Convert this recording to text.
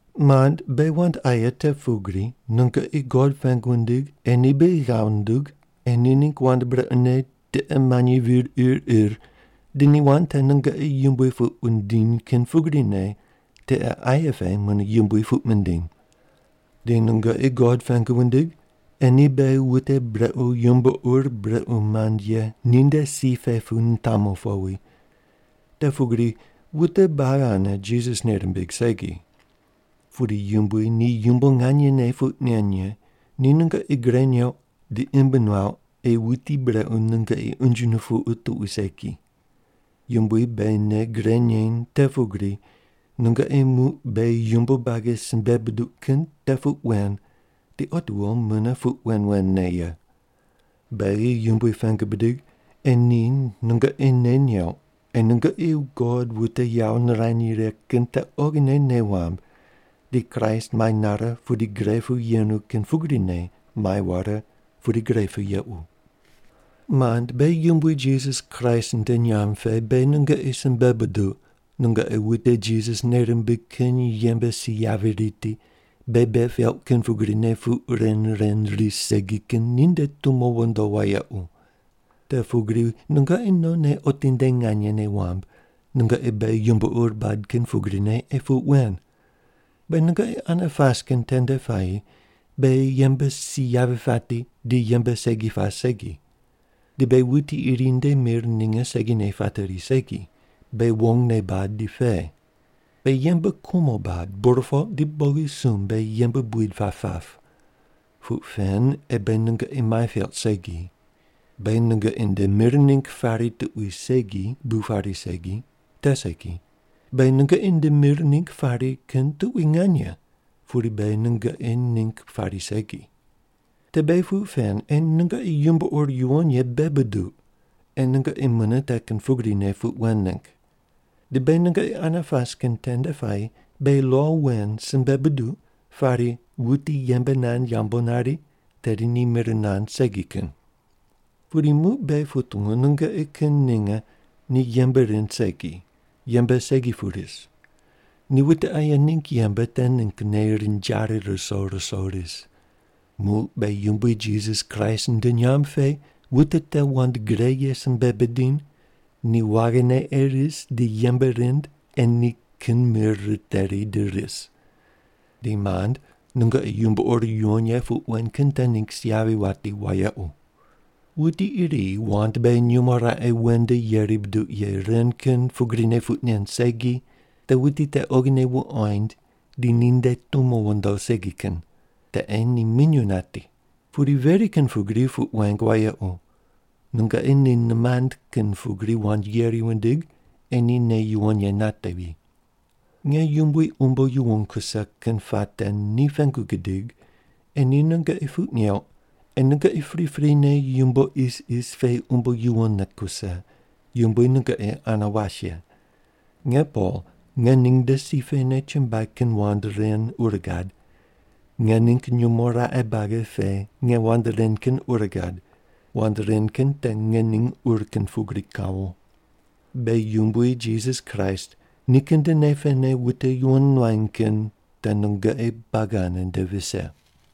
Mand, beghi wand aye te pugri, nungoqi God pengu wundig ei ni beghi ghav nundug ei ni ningg wand brequne tiqe manyi vir ir ir di ni wand te nungoqi yumbui puq wundiny kin pugrine tiqe aye pe mune yumbui puq mindiny. Di nungoqi God pengu wundig ei ni beghi wute brequ yumbo ur brequ mand ye ninde si pe pu nitamu powi. Te pugri wute buagi ane Jisas nei rimbig segi. Pudi Yumbui ni yumbo nganyene puq nen ye, ni nungoqi gre neuq di imb nuauq ei Wuti Brequ nungoqi unje nupuqu tuqui segi. Yumbui beghi nei gre neny te pugri nungoqi muq beghi yumbo buagi simbe buduq kin te puq wen di otiwo mune puq wen wen ne ye. Beghi Yumbui pengu bidig ei ni nungoqi nei neuq ei nungoqi God wute yawo nirany righe kin te oghine nei wamb di Kraist mai nare pudi gre pu yenu kin pugrine mai ware pudi gre pu yequ. Mand, beghi Yumbui Jisas Kraist nde nyamb pe beghi nungoqi simbe buduq, nungoqi wute Jisas nei rimbig kin yembe si yavi riti, beghi bei peuq kin pugrine puq ren ren ris segi kin ninde tumo wondo wayequ. Te pugri nungoqi nonne otinde nganye nei wamb nungoqi beghi yumbo ur bad kin pugrine ei puq wen. Beghi nungoqi ane pas kin tende puayi beghi yembe si yavi pati di yembe segi pas segi. Di beghi wuti iri nde mir ninge segine pateri segi, beghi wongne bad di pe. Beghi yembe kumo bad, burpoq di bogisumb beghi yembe buid pap pap. Puq pen ei beghi nungoqi mai peuq segi. Beghi nungoqi nde mir ningg pari kin tuqui segi bu pari segi te segi, beghi nungoqi nde mir ningg pari kin tuqui nganye, pudi beghi nungoqi ningg pari segi. Te beghi puq pen ei nungoqi yumbo ur yuwon ye bei buduq ei nungoqi mune te kin pugrine puq wen ningg. Di beghi nungoqi ane pas kin tende puayi beghi lo wen simbe buduq pari, “Wuti yembe nand yambu nari te ni mir nand segi kin.” Pudi muq beghi putungu nungoqi kin ninge ni yembe rind segi, yembe segi pu ris. Ni wute aye ningg yembe te ninggne rinjari ruso ruso ris. Muq beghi Yumbui Jisas Kraist nde nyamb pe wute te wand gre ye simbe bidiny ni waghine ei ris di yembe rind ei ni kin mir riteri di ris. Di, mand, nungoqi yumbo ur yuwon ye puq wen kin te ningg si yavi wati wayequ. Wuti iri wand beghi nyumo raqe wen nde yeri buduq ye ren kin pugrine puq nen segi, te wuti te oghine wuqoind di ninde tumo wondo segi kin. Te ei ni minyuw nati. Pudi veri kin pugri puq weng wayequ, nungoqi ni nimand kin pugri wand yeri wundig ei ni nei yuwon ye natevi. Nge Yumbui umbo yuwon kuse kin puate ni pengu gidig ei ni nungoqi puq neuq ei nungoqi priprine yumbo isis pe umbo yuwonne kuse. Yumbui nungoqi ane was ye. Nge Pol ngening nde si pene chumbuai kin wand ren ur gad. Nge ningg nyumo raqe buagi pe nge wand ren kin ur gad. Wand ren kin te ngening ur kin pugri kawo. Beghi Yumbui Jisas Kraist nikin nde nei pene wute yuwon nuany kin te nungoqi buagi ane nde vise.